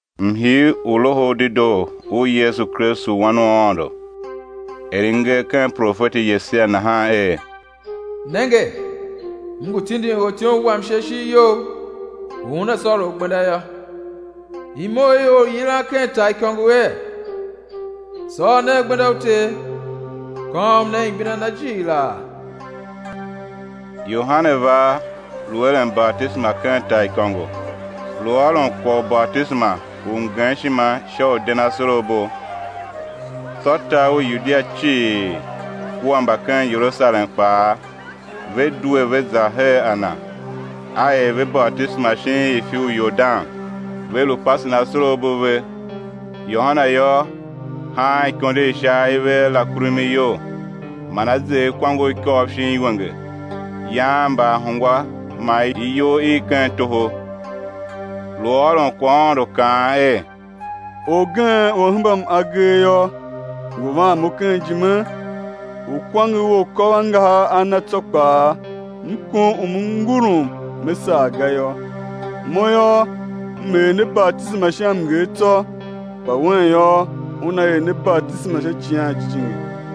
Mhii u Loho u Dedoo u Yesu Kristu wan u Aôndo, er i nger ken profeti Yesaia nahan er: Nenge, M ngu tindin ortyom Wam sha ishigh You u una sôr U gbenda yô; imo i or u yilan ken taaikôngo er: Sôr nen gbenda u Ter, kôôm nen igbenda Na jighilaa. Yohane va, lu eren batisema ken taaikôngo, lu ôron kwagh u batisema u mgemshima sha u den asorabo. Tsô tar u Yudia cii kua mba ken Yerusalem kpaa, ve due ve za her a na; a er ve batisema shin ifi u Yordan, ve lu pasen asorabo a ve. Yohane yô, haan ikondo i sha aive a rakumi iyol, man a zer kwange u ikôv shin iwenge, yaan mbaahungwa man iyough i ken toho. Lu ôron kwaghaôndo, kaan er: Orgen u A hembam agee yô, ngu van mo ken ijime, u kwange u akôvangahar a Na tsô kpaa, m kom u me ngurum me sagh ga yô. Mo yô, m er ne batisema sha mnger tsô, kpa Un yô, Una er ne batisema sha Icighan Jijingi.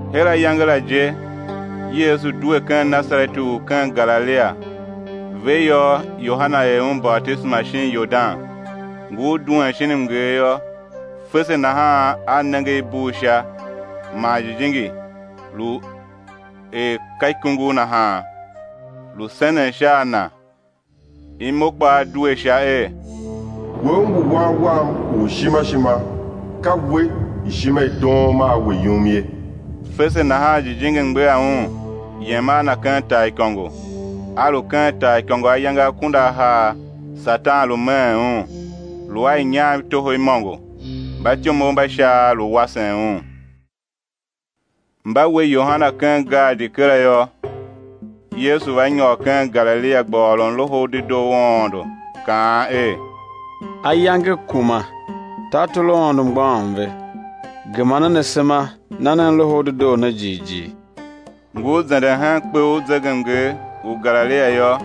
Her ayange la je Yesu due ken Nasareti u ken Galilia; ve yô, Yohane er Un batisema shin Yordan. Ngur duen shin mnger yô, fese nahan A nenge i bugh Sha, man Jijingi, lu er ka ikungugh nahan, lu senen sha a Na. Imo kpaa due Sha, er: We, U ngu Wan Wam u ishima ishima, ka We ishima i doom a We yum ye. Fese nahan Jijingi mgbegha Un, yem a Na ken taaikôngo. A lu ken taaikôngo ayange akunduahar, Satan lu meen Un; lu a inyam i toho imôngo; mbatyomov mba Shaav lu wasen Un. Mba we Yohane ken gaadi kera yô, Yesu va nyôr ken Galilia gba ôron Loho u Dedoo u Aôndo, kaan er: Ayange kuma, tartor u Aôndo mgbôghom ve; gema nen asema, na nen Loho u Dedoo ne jighjigh. Ngur zenden hen kpe u zegemnger u Galilia yô,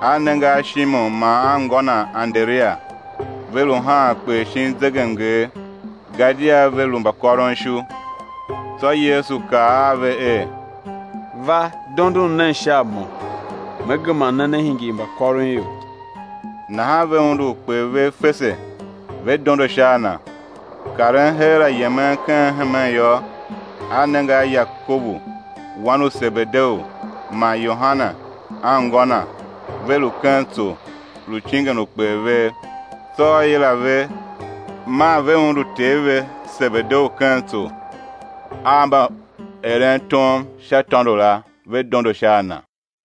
A nenge a Shimon man anngô na Anderia; ve lu haan kper shin zegemnger; gadia ve lu mbakôronishu. Tsô Yesu kaa a ve er: Va dondon nen sha a Mo, Me gema ne, né hingir mbakôronior. Nahan ve undu ukper vev fese, ve dondo sha a Na. Karen heera, yemen ken hemen yô, A nenge a Yakobu, wan u Sebedeu, man Yohane anngô na, ve lu ken tso, lu cingen ukper vev. Tsô A yila ve; maa ve undu ter ve, Sebedeu, ken tso, a mbaerentom sha tôndo la, ve dondo sha a Na.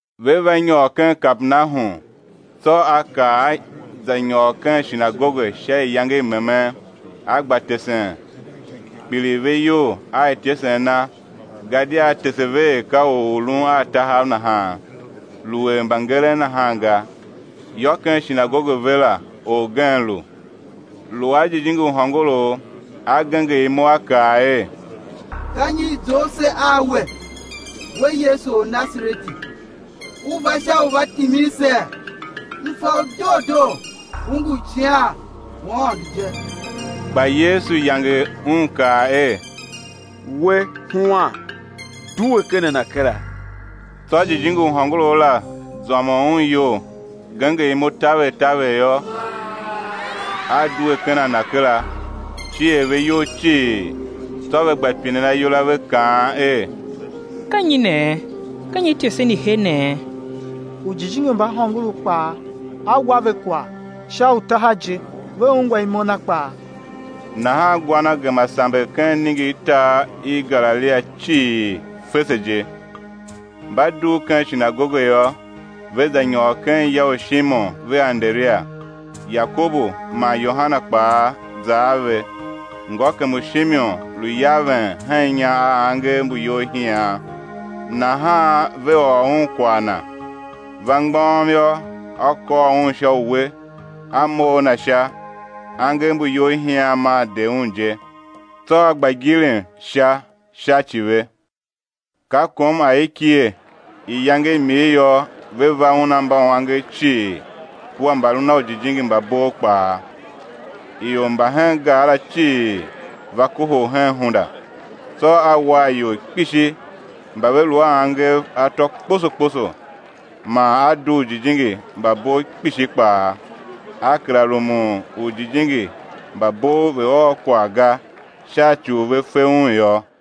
Ve va nyôr ken Kapernahum. Tsô A kar A za nyôr ken shinagoge sha iyange i memen, A gba tesen. Kpiligh ve iyol a ityesen Na, gadia A tese ve er ka or u lun a tahav nahan, lu er mbangeren nahan ga. Yô, ken shinagoge ve la orgen lu, lu a jijingi u hôngorough, a genger imo a kaa er: Ka nyi i zough se a We, We Yesu Ornasareti, U va sha u va timin see? M fa U doo doo, U ngu Icighan u Aôndo je. Kpa Yesu yange un, kaa er: We, huan, due ken a na kera. Tsô jijingi u hôngorough la zômon un iyol; genger imo taver taver yô, a due ken a na kera. Cier ve iyol cii; tsô ve gba pinen ayol a ve, kaan er: Ka nyi nee? Ka nyi ityesen i he nee? Ujijingi mba hôngorough kpaa A wa ve kwagh sha utaha je, ve ungwa imo Na kpaa. Nahan gwa Na gema samber ken iningirtar i Galilia cii, fese je. Mba dugh ken shinagoge yô, ve za nyôr ken ya u Shimon vea Anderia. Yakobu man Yohane kpaa za a ve. Ngôkem u Shimon lu yaven hen inya a angev mbu iyolhian; nahan ve ôr Un kwagh na. Va mgbôghom yô, A kôr un sha uwe, A mough a na sha; angev mbu iyolhian maa de un je; tsô a gba gilim sha sha ci ve. Ka kom aikighe, iyange i mir yô, ve va Un a mbauangev cii kua mbalun a ujijingi mba bov kpaa. Ior mba hen gar la cii va kohol hen hunda. Tsô A war ior kpishi mba ve lu a angev atô kposo kposo, man A dugh ujijingi mba bov kpishi kpaa; A kera rumun u ujijingi mba bov ve̱ ôr kwagh ga, sha ci u ve fe Un yô.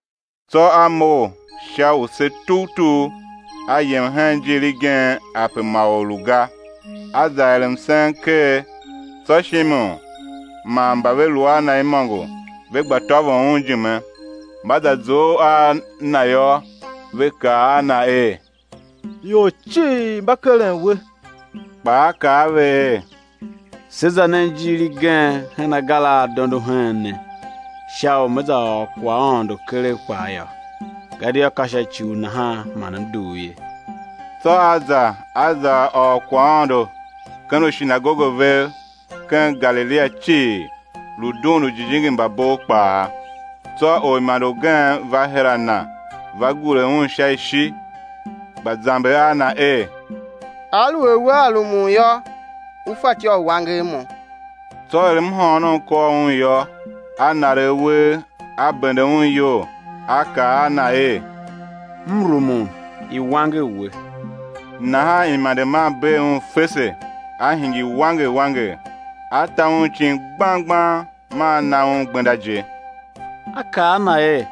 Tsô A mough sha use tugh tugh, A yem hen ijiir igen ape ma or lu ga, A za er msen ker. Tsô Shimon man mba ve lu a Na imôngo ve gba tôvon Un ijime. Mba za zough a Na yô, ve kaa a Na er: Ior cii mba keren We. Kpa A kaa a ve er: Se za nen ijiir igen hen agar a a dondo heen ne, sha u Ne za ôr kwaghaôndo keregh kpaa yô, gadia ka sha ci u nahan man M dugh ye. Tsô A za, A za ôr kwaghaôndo ken ushinagoge vev ken Galilia cii, lu dughun ujijingi mba bov kpaa. Tsô orimande ugen va her a Na, va gure Un sha ishi, gba zamber a Na er: Aluer Wea rumun yô, U fatyô u wanger mo. Tsô er mhôônom kôr Un yô, A naregh uwegh, A bende un iyol, A kaa a na er: M rumun, i̱ wanger we. Nahan imande maa bee un fese, a hingir wanger wanger. A ta un icin gbang gbang maa A na un gbenda je; A kaa a na er: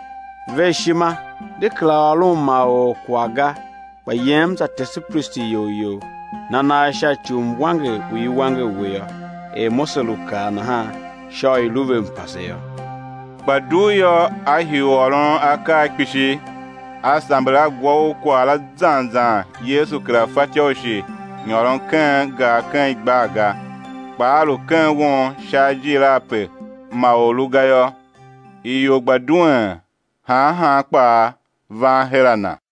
Ver ishima, de kera ôron ma or kwagh ga, kpa yem za tese pristi iyol you, na nagh sha ci u mwanger u i wanger we yô, er Mose lu kaa nahan, sha u i̱ lu ve mpase yô. Kpa dugh yô, a hii u ôron akaa kpishi, a samber a gwa u kwagh la zan zan Yesu kera fatyô u shi nyôron ken gar ken igbar ga, kpa A lu ken won sha ajiir ape ma or lu ga yô, ior gba duen han han kpaa, van her a Na.